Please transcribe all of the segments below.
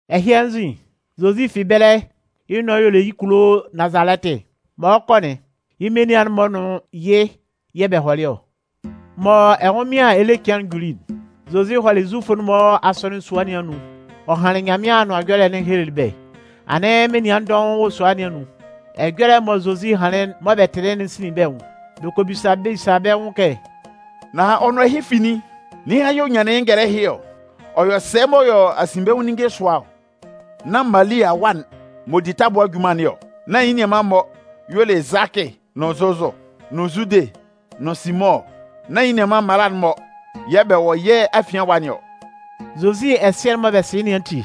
Ɛhɩ anzin, Zozi fi ɛbɛlɛ yɩ́ nʋan y'ɔ le yɩ́ kulo Nazalɛtɩ. Mɔ ɔ 'kɔ'n, yɩ́ menian'n-mɔ nʋn yɩ́ yɛ̂ bɛ hɔlɩ ɔ. Mɔ ɛnwʋnmɩan ele cɩan'n juli'n, Zozi hɔlɩ Zufʋ'n-mɔ asɔnɩn sua nɩn anun ɔ hanlɩn Nyanmɩan Anʋan Ɛjɔlɛ'n ɔ helelɩ bɛ́. Anɩn menian dɔʋn wɔ sua nɩn anun. Ɛjɔlɛ mɔ Zozi hanlɩn mɔ bɛ tɩlɩ'n sinlin bɛ́ nwʋn. Bɛ kɔ bisa bisa bɛ́ nwʋn kɛ: “Nan ɔ nʋn ɛhɩ fi nin? Ninhan yɛ̂ ɔ nyanlɩn yɩ́ ngɛlɛ ɛhɩ ɔ? Ɔ yɔ sɛ mɔ ɔ yɔ asinbɛnwʋn ninnge sʋa ɔ? Nán Mali awa'n m'ɔ di tabʋa junman nɩn ɔ? Nán yɩ́ nianman-mɔ y'ɔ le Zʋakɩ nʋn Zozʋ, nʋn Zudɩ nʋn Simʋn ɔ? Nán yɩ́ nianman mmala'n-mɔ yɛ̂ bɛ wɔ yɛ́ afian ɛwa nɩn ɔ?” Zozi ɛsɩɛ mɔ bɛ sɩ yɩ́ nɩn ati,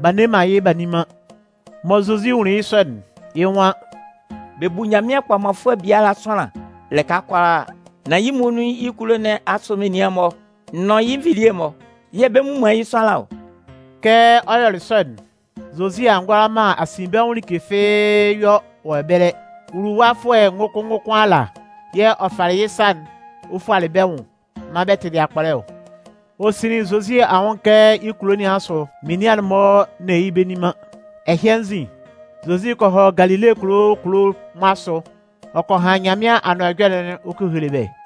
b'a nne man yɩ́ b'a nni man. Mɔ Zozi nwunlin yɩ́ sɔ'n, yɩ́ nwan: “Bɛ bu Nyanmɩan kpɔmanfʋɛ biala sʋanlan lɩka kʋalaa. Nan yɩ́ muonun yɩ́ kulo nɩn asʋ menian'n-mɔ nʋn yɩ́ nvilie'n-mɔ yɛ̂ bɛ mmu man yɩ́ sʋanlan ɔ.” Kɛ ɔ yɔlɩ sɔ'n, Zozi a ngʋala man asinbɛnwʋn like fɩ́ɩ́ yɔ wɔ ɛbɛlɛ. Nwuluwafʋɛ ngʋkʋn ngʋkʋn ala yɛ̂ ɔ falɩ yɩ́ sa'n ɔ fualɩ bɛ́ nwʋn maan bɛ tɩlɩ akpɔlɛ ɔ. Ɔ sinlin Zozi anwʋn kɛ yɩ́ kulo nɩn asʋ menian'n-mɔ nne yɩ́ bɛ nni man. Ɛhɩ anzin, Zozi kɔ hɔ Galile kulo kulo'n-mɔ asʋ ɔ kɔ han Nyanmɩan Anʋan Ɛjɔlɛ'n ɔ kɔ hele bɛ́.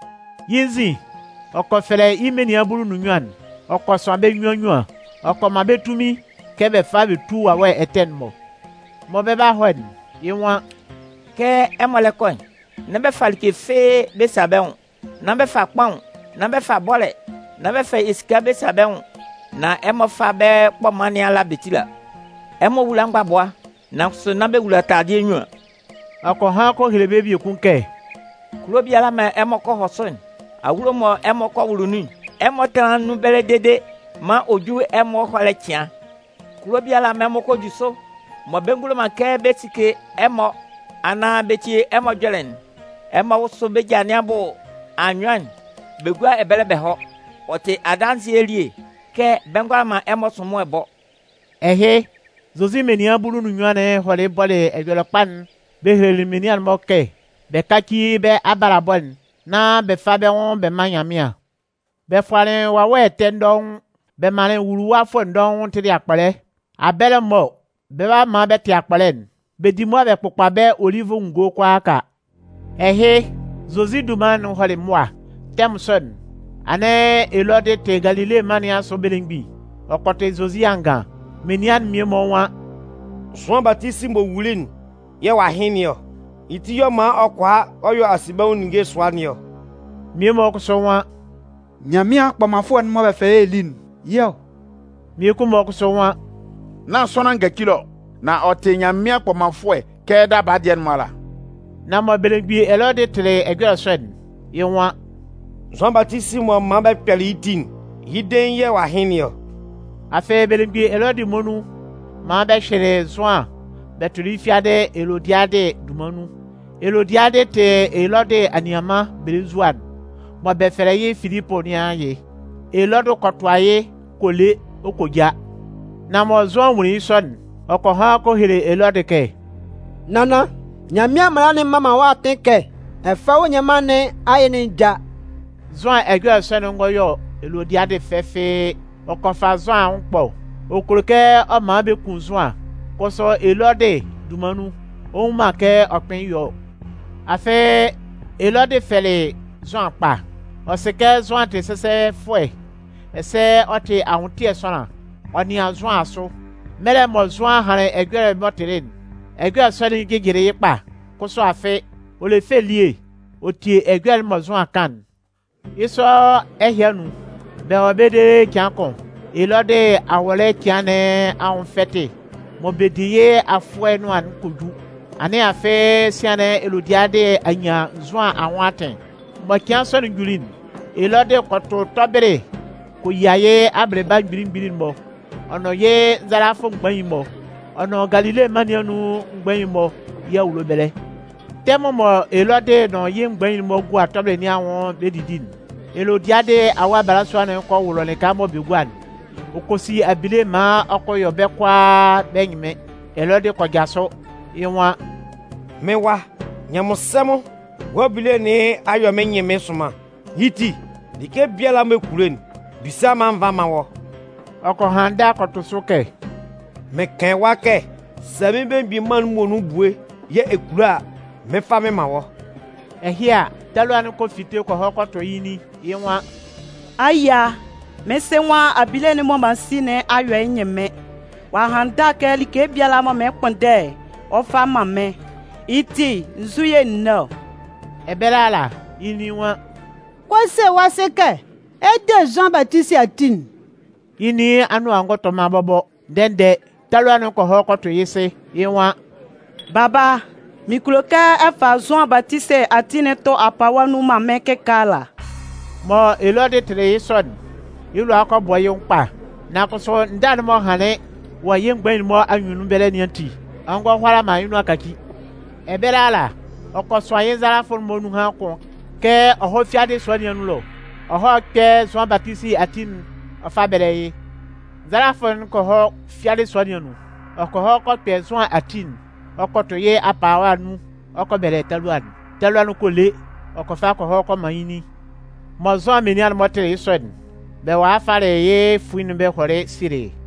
Yɩ́ nzin, ɔ kɔ fɛlɛ yɩ́ menian bulu nʋn nnyuan'n ɔ kɔ sʋan bɛ́ nnyuan nnyuan. Ɔ kɔ man bɛ́ tunmin kɛ bɛ fá bɛ tú wawɛ ɛtɛ'n-mɔ. Mɔ bɛ 'ba hɔ'n, yɩ́ nwan: “Kɛ ɛmɔ lɛ kɔ'n, nán bɛ fa like fɩ́ɩ́ bɛ sa bɛ́ nwʋn. Nán bɛ fa kpaʋn, nán bɛ fa bɔ́lɛ, nán bɛ fa esika bɛ sa bɛ́ nwʋn. Nan ɛmɔ fá bɛ́ kpɔman nɩn ala bɛ tíla. Ɛmɔ wúla mgbabʋa, nan kʋsʋ nán bɛ wula taladɩɛ nnyuan.” Ɔ kɔ han kɔ hele bɛ́ biekun kɛ: “Kulo biala mɔ ɛmɔ kɔ hɔ sʋ'n, awulo mɔ bɛ kɔ sike ɛmɔ nun'n, ɛmɔ tánlan nun ɛbɛlɛ dede maan ɔ jú ɛmɔ ɛhɔlɛ cɩan. Kulo biala mɔ ɛmɔ kɔ ju sʋ, mɔ bɛ ngulo man kɛ bɛ sike ɛmɔ anaan bɛ tie ɛmɔ ɛjɔlɛ'n, ɛmɔ wʋ́sʋ bɛ́ ja nɩn abʋ anyʋan'n bɛ gúa ɛbɛlɛ bɛ hɔ́. Ɔ tɩ adanzɩɛ elie kɛ bɛ ngʋala man ɛmɔ sʋnmʋɛ bɔ.” Ɛhɩ, Zozi menian bulu nʋn nnyuan'n hɔlɩ bɔlɩ Ɛjɔlɛkpa'n bɛ helelɩ menian'n-mɔ kɛ bɛ káci bɛ́ abalabɔ'n nán bɛ fá bɛ́ nwʋn bɛ mán Nyanmɩan. Bɛ fʋanlɩn wawɛ ɛtɛ dɔʋn. Bɛ manlɩn nwuluwafʋɛ dɔʋn tɩlɩ akpɔlɛ. Abɛlɛ mɔ bɛ 'ba maan bɛ tɩ akpɔlɛ'n, bɛ di mʋa bɛ kpʋkpa bɛ́ olivʋ ngɔ kʋalaaka. Ɛhɩ, Zozi dunman'n hɔlɩ mʋa. Tɛmʋn sɔ'n, anɩn Elɔdɩ tɩ Galile mân nɩn asʋ belemgbin. Ɔ kɔ tɩ Zozi angan. Menian'n mmie-mɔ nwan: “Zʋan Batisi m'ɔ wuli'n yɛ̂ ɔ'a hɩn nɩn ɔ. Yɩ́ ti yɛ̂ ɔ man ɔ kʋala ɔ yɔ asinbɛnwʋn ninnge sʋa nɩn ɔ.” Mmie-mɔ kʋsʋ nwan: “Nyanmɩan kpɔmanfʋɛ'n mɔ bɛ fɛlɛ yɩ́ Eli'n, yɩ́ ɔ.” Mmiekun-mɔ kʋsʋ nwan: “Nán sʋanlan ngacile ɔ, nan ɔ tɩ Nyanmɩan kpɔmanfʋɛ kɛ daba dɩɛ'n-mɔ ala.” Nan mɔ belemgbin Elɔdɩ tɩlɩ ɛjɔlɛ sɔ'n, yɩ́ nwan: “Zʋan Batisi mɔ m man bɛ kpɛlɩ yɩ́ ti'n, yɩ́ dein yɛ̂ ɔ'a hɩn nɩn ɔ.” Afɩ belemgbin Elɔdɩ muonun man bɛ hyɩlɩ Zʋan bɛ tʋlɩ yɩ́ fiadɩ Elodiadɩ dunman nun. Elodiadɩ tɩ Elɔdɩ anianman belenzua'n mɔ bɛ fɛlɛ yɩ́ Filipʋ nɩn ayɩ. Elɔdɩ kɔ tʋa yɩ́ kɔ le ɔ kɔ ja. Nan mɔ Zʋan nwunlin yɩ́ sɔ'n, ɔ kɔ han kɔ hele Elɔdɩ kɛ: “Nannan, Nyanmɩan mala'n mman man wɔ́ atɩn kɛ ɛ fá wɔ́ nianman nɩn ayɩ'n já.” Zʋan ɛjɔlɛ sɔ'n ngɔ yɔ Elodiadɩ fɛ fɩ́ɩ́. Ɔ kɔ fa Zʋan anwʋn ɛkpɔ. Ɔ kulo kɛ ɔ man bɛ kun Zʋan, kʋsʋ Elɔdɩ dunman nun, ɔ nnwun man kɛ ɔ kpɩn yɔ ɔ. Afɩ Elɔdɩ fɛlɩ Zʋan kpa. Ɔ sɩ kɛ Zʋan tɩ sɛsɛfʋɛ ɛsɛ ɔ tɩ anwʋntɩɛ sʋanlan. Ɔ nɩan Zʋan asʋ. Mɛlɛ mɔ Zʋan hanlɩn ɛjɔlɛ'n m'ɔ tɩlɩ'n, ɛjɔlɛ sɔ'n jɩjɩlɩ yɩ́ kpa. Kʋsʋ afɩ, ɔ le fɛ elie ɔ tie ɛjɔlɛ'n mɔ Zʋan kan'n. Yɩ́ sɔ ɛhɩ anun, bɛ wɔ ɛbɛlɛ dede cɩan kʋn, Elɔdɩ awɔlɛ cɩan nɩn anwʋn fɛtɩ mɔ bɛ di yɩ́ afʋɛ nʋan'n kɔ ju. Anɩn afɩ sian'n Elodiadɩ a nyan Zʋan anwʋn atɩn. Mɔ cɩan sɔ'n juli'n, Elɔdɩ kɔ tʋ tɔbɩlɩ kɔ yia yɩ́ abɩlɩba mgbili mgbili'n-mɔ ɔ nʋn yɩ́ nzalafʋ mgbain'n-mɔ ɔ nʋn Galile mân nɩn anun mgbain'n-mɔ yɩ́ awulo ɛbɛlɛ. Tɛmʋn mɔ Elɔdɩ nʋn yɩ́ mgbain'n-mɔ gua tɔbɩlɩ nɩn anwʋn bɛ 'didi'n, Elodiadɩ awa balasua'n kɔ wʋlʋ lɩka mɔ bɛ gua'n, ɔ kɔ si abile maan ɔ kɔ yɔ bɛ́ kʋalaa bɛ́ ɛnyɩnmɩn. Elɔdɩ kɔ jasʋ, yɩ́ nwan: “Mɩ́n wa, nyanmɩnsɛmʋn, wɔ́ abile nɩn a yɔ mɩ́n ɛnyɩnmɩn sʋnman. Yɩ́ ti, like biala mɔ ɛ kulo'n, bisa maan n vá m mán wɔ́.” Ɔ kɔ han ndâ kɔ tʋ sʋ kɛ: “Mɩn kan ɛwa kɛ sɛ mɩ́n belemgbin mân'n muonun ebue yɛ̂ ɛ kulo a, mɩn 'fa mɩn man wɔ́.” Ɛhɩ a, talua'n kɔ fite kɔ hɔ kɔ tʋ yɩ́ nin. Yɩ́ nwan: “Ayia, mɩ́n sɩ nwan abile'n mɔ m'an si nɩn a yɔ yɩ́ ɛnyɩnmɩn. Ɔ'a han ndâ kɛ like biala mɔ mɩn 'kpʋnndɛ'n, ɔ 'fa man mɩ́n. Yɩ́ ti, nzu yɛ̂ n né ɔ?” Ɛbɛlɛ ala, yɩ́ nin nwan: “Kɔ se wɔ́ sɩ kɛ ɛ 'de Zʋan Batisi ati'n.” Yɩ́ nin anʋan ngɔ tɔ man bɔbɔ, ndɛ-ndɛ talua'n kɔ hɔ kɔ tʋ yɩ́ sɩ, yɩ́ nwan: “Baba, mɩn kulo kɛ ɛ fa Zʋan Batisi ati'n tʋ apawa nun man mɩ́n kɩkaala.” Mɔ Elɔdɩ tɩlɩ yɩ́ sɔ'n, yɩ́ lʋa kɔ bɔ yɩ́ nwʋn kpa. Nan kʋsʋ ndâ'n m'ɔ hanlɩn wɔ yɩ́ mgbain'n-mɔ anyunnun ɛbɛlɛ nɩn ati, ɔ ngɔ hʋala man yɩ́ nʋan kaci. Ɛbɛlɛ ala, ɔ kɔ sʋan yɩ́ nzalafʋ'n-mɔ nunhan kʋn kɛ ɔ hɔ́ fiadɩ sua nɩn anun ɛlɔ, ɔ hɔ́ kpɛ́ Zʋan Batisi ati'n ɔ fá bɛ́lɛ yɩ́. Nzalafʋ'n kɔ hɔ fiadɩ sua nɩn anun. Ɔ kɔ hɔ kɔ kpɛ Zʋan ati'n ɔ kɔ tʋ yɩ́ apawa nun ɔ kɔ bɛlɛ talua'n. Talua'n kɔ le, ɔ kɔ fa kɔ hɔ kɔ man yɩ́ nin. Mɔ Zʋan menian'n-mɔ tɩlɩ yɩ́ sɔ'n, bɛ walɩ falɩ yɩ́ fuin'n bɛ hɔlɩ sielɩ yɩ́.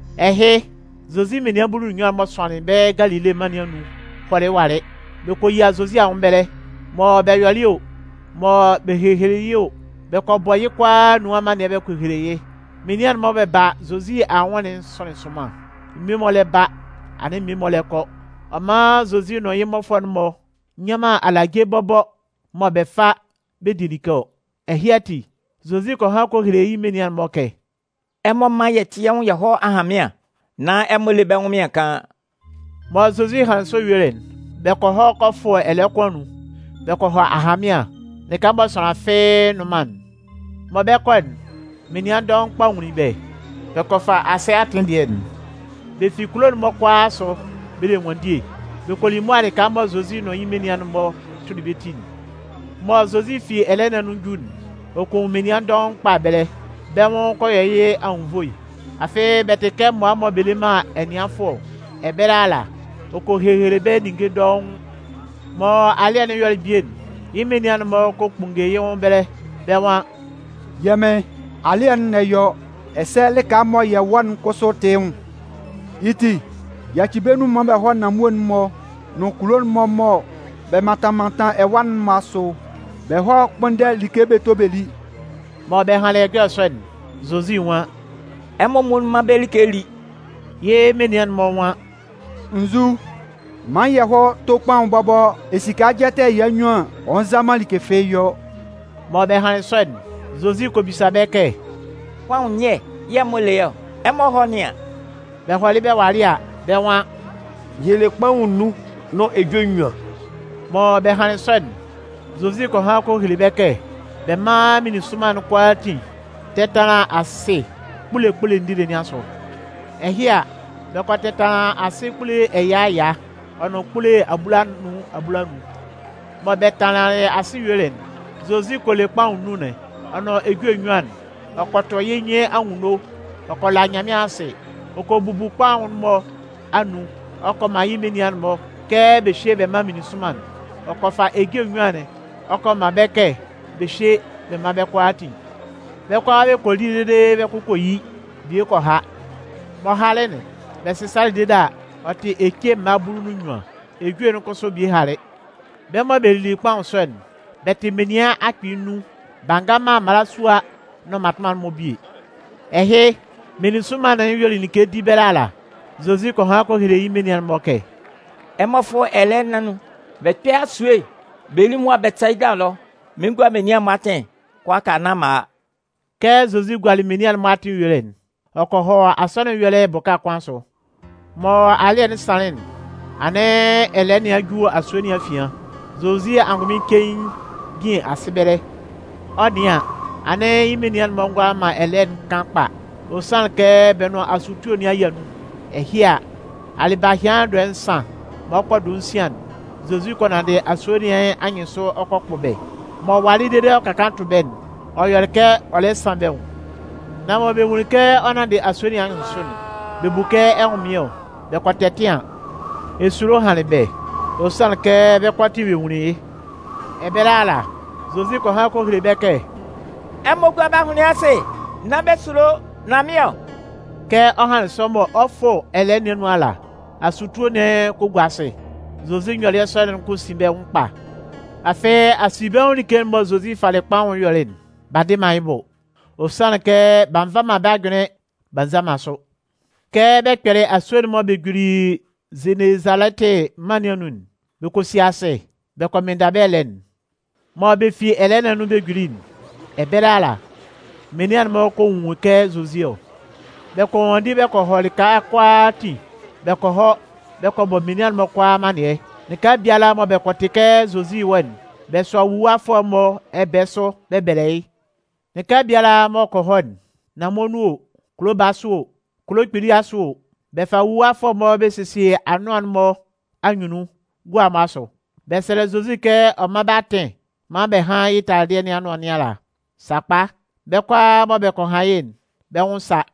Ɛhɩ, Zozi menian bulu nʋn nnyuan'n m'ɔ sʋanlɩn bɛ́ Galile mân nɩn anun'n hɔlɩ walɩ, bɛ kɔ yia Zozi anwʋn ɛbɛlɛ. Mɔ bɛ yɔlɩ o, mɔ bɛ hehelelɩ o, bɛ kɔ bɔ yɩ́ kʋalaa anun amannɩɛ bɛ kɔ hele yɩ́. Menian'n-mɔ mɔ bɛ ba Zozi anwʋn'n sʋnlɩn sʋnman. Mmie-mɔ lɛ ba, anɩn mmie-mɔ lɛ kɔ. Ɔ man Zozi nʋn yɩ́ mmɔfʋɛ'n-mɔ nnyan man alaje bɔbɔ mɔ bɛ fa bɛ di like ɔ. Ɛhɩ ati, Zozi kɔ han kɔ hele yɩ́ menian'n-mɔ kɛ: “Ɛmɔ mán yɛ tɩ́ yɛ́ nwʋn yɛ hɔ́ ahanmɩan, nán ɛmɔ lé bɛ́ ɛnwʋnmɩan kaan.” Mɔ Zozi hanlɩn sɔ yuelɩ'n, bɛ kɔ hɔ kɔ fʋ ɛlɛɛ kʋn anun, bɛ kɔ hɔ ahanmɩan, lɩka mɔ sʋanlan fɩ́ɩ́ nnʋn man'n. Mɔ bɛ 'kɔ'n, menian dɔʋn kpa nwunlin bɛ́. Bɛ kɔ fa asɩ atɩn dɩɛ'n. Bɛ fi kulo'n-mɔ kʋalaa asʋ bɛ le ɛnwanndie. Bɛ kɔ li mʋa lɩka mɔ Zozi nʋn yɩ́ menian'n-mɔ tʋlɩ bɛ́ ti'n. Mɔ Zozi fi ɛlɛɛ nɩn anun 'ju'n, ɔ kɔ nwun menian dɔʋn kpa ɛbɛlɛ. Bɛ́ nwʋn kɔ yɔ yɩ́ anwunnvoe. Afɩ bɛ tɩ kɛ mmʋa mɔ bɛ le man ɛnɩanfʋɛ ɔ. Ɛbɛlɛ ala, ɔ kɔ hehele bɛ́ ninnge dɔʋn. Mɔ alɩ́ɛ'n yɔlɩ bie'n, yɩ́ menian'n-mɔ kɔ kpunnge yɩ́ nwʋn ɛbɛlɛ, bɛ́ nwan: “Yɛ́ Mɩn, alɩ́ɛ'n lɛ yɔ, ɛsɛ lɩka mɔ yɛ wɔ'n kʋsʋ tɩ yɩ́ nwʋn. Yɩ́ ti, yaci bɛ́ nun maan bɛ hɔ́ nanmue'n-mɔ nʋn kulo'n-mɔ mɔ bɛ mantan mantan ɛwa'n-mɔ asʋ bɛ hɔ́ kpʋ́nndɛ like bɛ tó bɛ lí.” Mɔ bɛ hanlɩn ɛjɔlɛ sɔ'n, Zozi nwan: “Ɛmɔ muonun mán bɛ́ like lí.” Yɩ́ menian'n-mɔ nwan: “Nzu? Man yɛ hɔ́ tó kpaʋn bɔbɔ esika jɛtɛ ɛya nnyuan an, ɔ nza man like fɩ́ɩ́ yɔ.” Mɔ bɛ hanlɩn sɔ'n, Zozi kɔ bisa bɛ́ kɛ: “Kpaʋn nyɛ yɛ̂ ɛmɔ le ɔ? Ɛmɔ hɔ́ nɩ́an.” Bɛ hɔlɩ bɛ walɩ a, bɛ́ nwan: “Yɛ le kpaʋn nnun nʋn ejue nnyuan.” Mɔ bɛ hanlɩn sɔ'n, Zozi kɔ han kɔ hele bɛ́ kɛ bɛ mán meninsʋnman'n kʋalaatin tɛ́tanlan asɩ kpule kpule ndile nɩn asʋ. Ɛhɩ a, bɛ kɔ tɛtanlan asɩ kpule ɛya ɛya, ɔ nʋn kpule abulanun abulanun. Mɔ bɛ tanlanlɩn asɩ yuelɩ'n, Zozi kɔ le kpaʋn nnun'n, ɔ nʋn ejue nnyuan'n. Ɔ kɔ tʋ yɩ́ nyɩn anwunno, ɔ kɔ la Nyanmɩan asɩ. Ɔ kɔ bubu kpaʋn'n-mɔ anun ɔ kɔ man yɩ́ menian'n-mɔ kɛ bɛ hyé bɛ mán meninsʋnman'n. Ɔ kɔ fa ejue nnyuan'n ɔ kɔ man bɛ́ kɛ bɛ hyé bɛ mán bɛ́ kʋalaatin. Bɛ́ kʋalaa bɛ kɔ li dede bɛ́ kʋ kɔ yi, bie kɔ ha. M'ɔ halɩ'n, bɛ sɩsalɩ dede a, ɔ tɩ ece mma bulu nʋn nnyuan. Ejue'n kʋsʋ bie halɩ. Bɛ́ mɔ bɛ lili kpaʋn sɔ'n, bɛ tɩ menian akpɩɩ nnun. B'a nga man mmalasua nʋn mmatʋnman'n-mɔ bie. Ɛhɩ, meninsʋnman'n yuelɩ like di ɛbɛlɛ ala, Zozi kɔ han kɔ hele yɩ́ menian'n-mɔ kɛ: “Ɛmɔ fʋ́ ɛlɛɛ nɩn anun bɛ kpɛ́ asue'n bɛ lí mʋa Bɛtɩsayida ɛlɔ. Mɩn 'gua menian'n-mɔ atɩn kʋalaaka nán m'an a.” Kɛ Zozi gualɩ menian'n-mɔ atɩn yuelɩ'n, ɔ kɔ hɔ asɔnɩn ɛyɔlɛ bʋka kʋn asʋ. Mɔ alɩ́ɛ'n sanlɩn'n, anɩn ɛlɛɛ nɩn a ju asue nɩn afian. Zozi angʋnmɩn cein jin asɩ ɛbɛlɛ. Ɔ 'nɩan an, anɩn yɩ́ menian'n-mɔ ngʋala man ɛlɛɛ'n kan kpa. Ɔ sanlɩn kɛ bɛ nʋn asutue nɩn a yia nun. Ɛhɩ a, alɩbahɩan dɔɛ nsan mɔ ɔ 'kɔ dɔɛ nsian'n, Zozi kɔ nanndɩ asue nɩn anyɩnsʋ ɔ kɔ kpʋ bɛ́. M'ɔ walɩ dede m'ɔ ka kaan tʋ bɛ́'n, ɔ yɔlɩ kɛ ɔ lɛ san bɛ́ nwʋn. Nan mɔ bɛ nwunlin kɛ ɔ nanndɩ asue nɩn anyɩnsʋ'n, bɛ bu kɛ ɛnwʋnmɩn ɔ. Bɛ kɔ tɛtɩan. Esulo hanlɩn bɛ́, ɔ sanlɩn kɛ bɛ́ kʋalaatin bɛ́ nwunlin yɩ́. Ɛbɛlɛ ala, Zozi kɔ han kɔ hele bɛ́ kɛ: “Ɛmɔ gúa bɛ́ ahʋnlɩn asɩ! Nán bɛ sulo nan mɩ́n ɔ!” Kɛ ɔ hanlɩn sɔ mɔ ɔ 'fʋ bɛ ɛlɛɛ nɩn anun ala, asutue'n kɔ gua asɩ. Zozi nyɔlɩɛ sɔ'n kɔ sin bɛ́ nwʋn kpa. Afɩ asinbɛnwʋn like'n mɔ Zozi falɩ kpaʋn'n yɔlɩ'n, b'a ndɩ man yɩ́ bʋ. Ɔ sanlɩn kɛ b'a nva man bɛ́ ajʋnlɩn b'a nza man sʋ. Kɛ bɛ kpɛlɩ asue'n mɔ bɛ juli Zenezalɛtɩ mân nɩn anun'n, bɛ kɔ si asɩ, bɛ kɔ mɩnnda bɛ́ ɛlɛɛ'n. Mɔ bɛ fi ɛlɛɛ nɩn anun bɛ juli'n, ɛbɛlɛ ala, menian'n-mɔ kɔ nwun kɛ Zozi ɔ. Bɛ kɔ nwanndi bɛ kɔ hɔ lɩka kʋalaatin bɛ kɔ hɔ kɔ bɔ menian'n-mɔ kʋalaa amannɩɛ. Lɩka biala mɔ bɛ kɔ tɩ kɛ Zozi wɔ'n, bɛ sʋa nwuluwafʋɛ'n-mɔ ɛbɛɛ sʋ bɛ bɛlɛ yɩ́. Lɩka biala m'ɔ kɔ hɔ'n, nanmue nun o, kulo baa asʋ o, kulo kpili asʋ o, bɛ fa nwuluwafʋɛ'n-mɔ bɛ sesie anʋan'n-mɔ anyunnun gua'n-mɔ asʋ. Bɛ sɛlɛ Zozi kɛ ɔ mán bɛ́ atɩn maan bɛ hán yɩ́ taladɩɛ nɩn anʋan nɩn ala. Sakpa, bɛ́ kʋalaa mɔ bɛ kɔ han yɩ́'n, bɛ́ nwʋn sa.